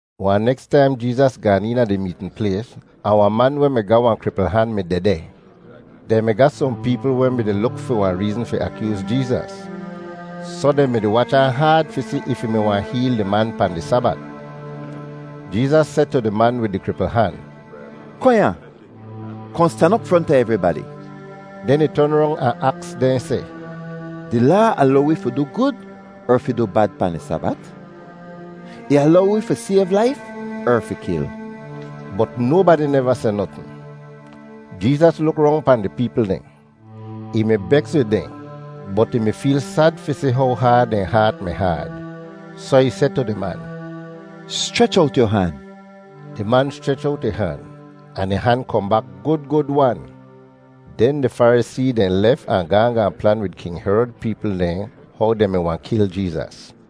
Wahn neks taim Jeezas gaan eena di meetn plays, ahn wahn man weh mi ga wahn kripl han mi dehdeh. Dehn mi ga sohn peepl weh mi-di luk fi wahn reezn fi akyooz Jeezas, soh dehn mi-di wach ahn haad fi si if ih mi wahn heel di man pahn di Sabat. Jeezas seh tu di man wid di kripl han, “Kohn ya. Kohn stan op fronta evribadi.” Den ih ton rong ahn aks dehn seh, “Di Laa alow wi fi du gud er fi du bad pahn di Sabat? Ih alow wi fi sayv laif er fi kil?” Bot nobadi neva seh notn. Jeezas luk rong pahn di peepl dehn. Ih mi beks wid dehn bot ih mi feel sad fi si how haad dehn haat mi haad. Soh ih seh tu di man, “Schrech owt yu han.” Di man schrech owt ih han ahn ih han kohn bak gud gud-wan! Den di Farisee dehn lef ahn gaahn gaahn plan wid King Herod peepl dehn how dehn mi wahn kil Jeezas.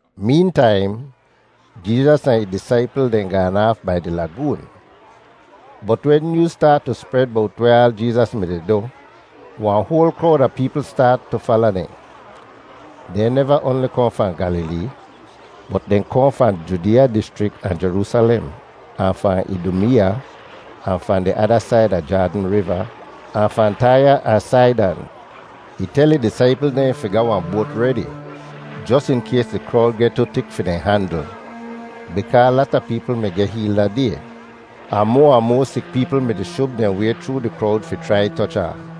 Meentaim, Jeezas ahn ih disaipl dehn gaan aaf bai di lagoon, bot wen nyooz staat tu spred bowt weh aal Jeezas mi-di du, wahn hoal krowd a peepl staat tu fala dehn. Dehn neva oanli kohn fahn Gyalilee, bot dehn kohn fahn Judeeya dischrik ahn Jeroosalem, ahn fahn Idumeeya, ahn fahn di ada said a Jaadn Riva, ahn fahn Taiya ahn Saidan. Ih tel ih disaipl dehn fi ga wahn boat redi, jos in kays di krowd geh tu tik fi dehn handl, bikaa lata peepl mi geh heel da day, ahn moa ahn moa sik peepl mi-di shub dehn way chroo di krowd fi chrai toch ahn.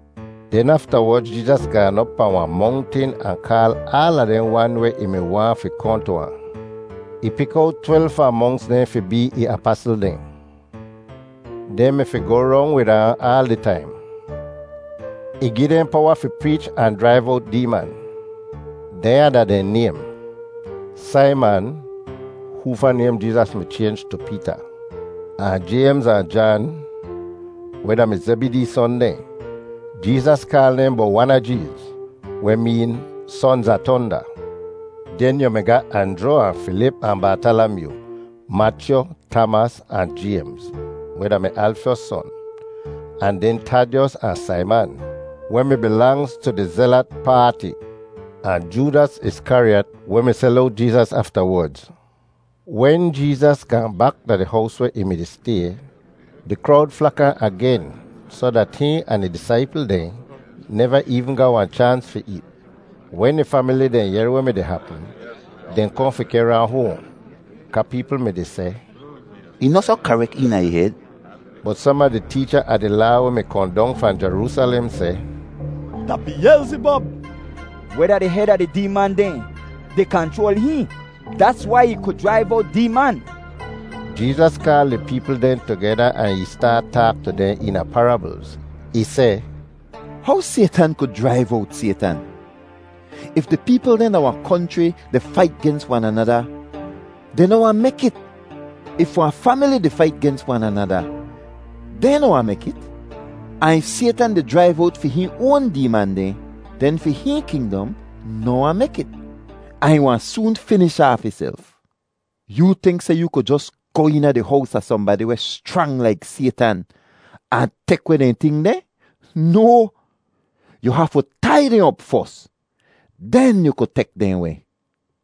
Den aftawodz Jeezas gaan op pahn wahn mongtin ahn kaal aala dehn wan weh ih mi waahn fi kohn tu ahn. Ih pik owt twelv fahn monks dehn fi bee ih apasl dehn. Dehn mi fi goh rong wid ahn aal di taim. Ih gi dehn powa fi preech ahn jraiv owt deeman. Dehnya da dehn naym: Saiman (hoofa naym Jeezas mi chaynj tu Peeta); ahn Jaymz ahn Jan, weh da-mi Zebidee son dehn (Jeezas kaal dehn Bowanajeez, weh meen “Sonz a Tonda”). Den yu mi ga Anjru ahn Filip ahn Bartalamyoo; Machyu, Tamas, ahn Jaymz, weh da-mi Alfyos son; ahn den Tadyos ahn Saiman, weh mi bilangz tu di Zelat Paati, ahn Joodas Iskariyat, weh mi sel owt Jeezas aftawodz. Wen Jeezas gaahn bak da di hows weh ih mi-di stay, di krowd flak ahn agen soh dat hihn ahn ih disaipl dehn neva eevn ga wahn chaans fi eet. Wen ih famili dehn yehr weh mi-di hapm, dehn kohn fi kehr ahn hoahn kaa peepl mi-di seh, “Ih noh soh karek eena ih hed.” Bot som a di teecha a di Laa weh mi kohn dong fahn Jeroosalem seh, “Da Biyelzibob, weh da di hed a di deeman dehn, di kanchroal hihn. Dats wai ih ku jraiv owt deeman.” Jeezas kaal di peepl dehn tugeda ahn ih staat taak tu dehn eena parablz. Ih seh, “How Saytan ku jraiv owt Saytan? If di peepl dehn da wahn konchri di fait gens wan anada, dehn noh wahn mek it. If wahn famili di fait gens wan anada, dehn noh wahn mek it. Ahn if Saytan di jraiv owt fi hihn oan deeman dehn, den fi hihn kingdom noh wahn mek it ahn ih wahn soon finish aaf ihself. Yoo tink seh yu ku jos goh eena di hows a sohnbadi weh schrang laik Saytan ahn tek weh dehn ting dehn? No. Yu hafu tai dehn op fos. Den yu ku tek dehn weh.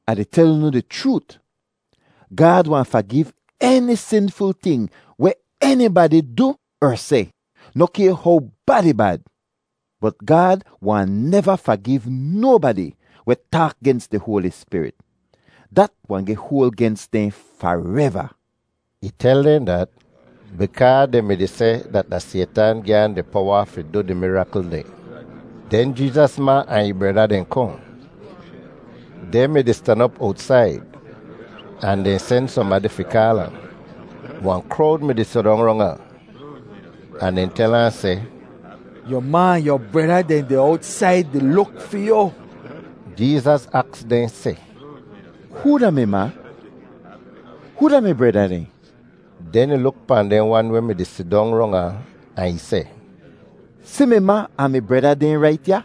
“Ah di tel unu di chroot, Gaad wahn fagiv eni sinful ting weh enibadi du er seh, noh kay how bad ih bad. Bot Gaad wahn neva fagiv nobadi weh taak gens di Hoali Spirit. Dat wahn geh hoal gens dehn fareva.” Ih tel dehn dat bikaa dehn mi-di seh dat da Saytan gi ahn di powa fi du di mirakl dehn. Den Jeezas ma ahn ih breda dehn kohn. Dehn mi-di stan op owtsaid, ahn dehn sen sohnbadi fi kaal ahn. Wahn krowd mi-di sidong rong ahn, ahn dehn tel ahn seh, “Yu ma ahn yu breda dehn deh owtsaid di luk fi yu.” Jeezas aks dehn seh, “Hoo da mi ma? Hoo da mi breda dehn?” Den ih luk pahn dehn wan weh mi-di sidong rong ahn, ahn ih seh, “Si mi ma ahn mi breda dehn rait ya.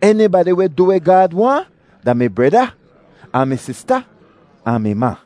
Enibadi weh du weh Gaad waahn da mi breda, ahn mi sista, ahn mi ma.”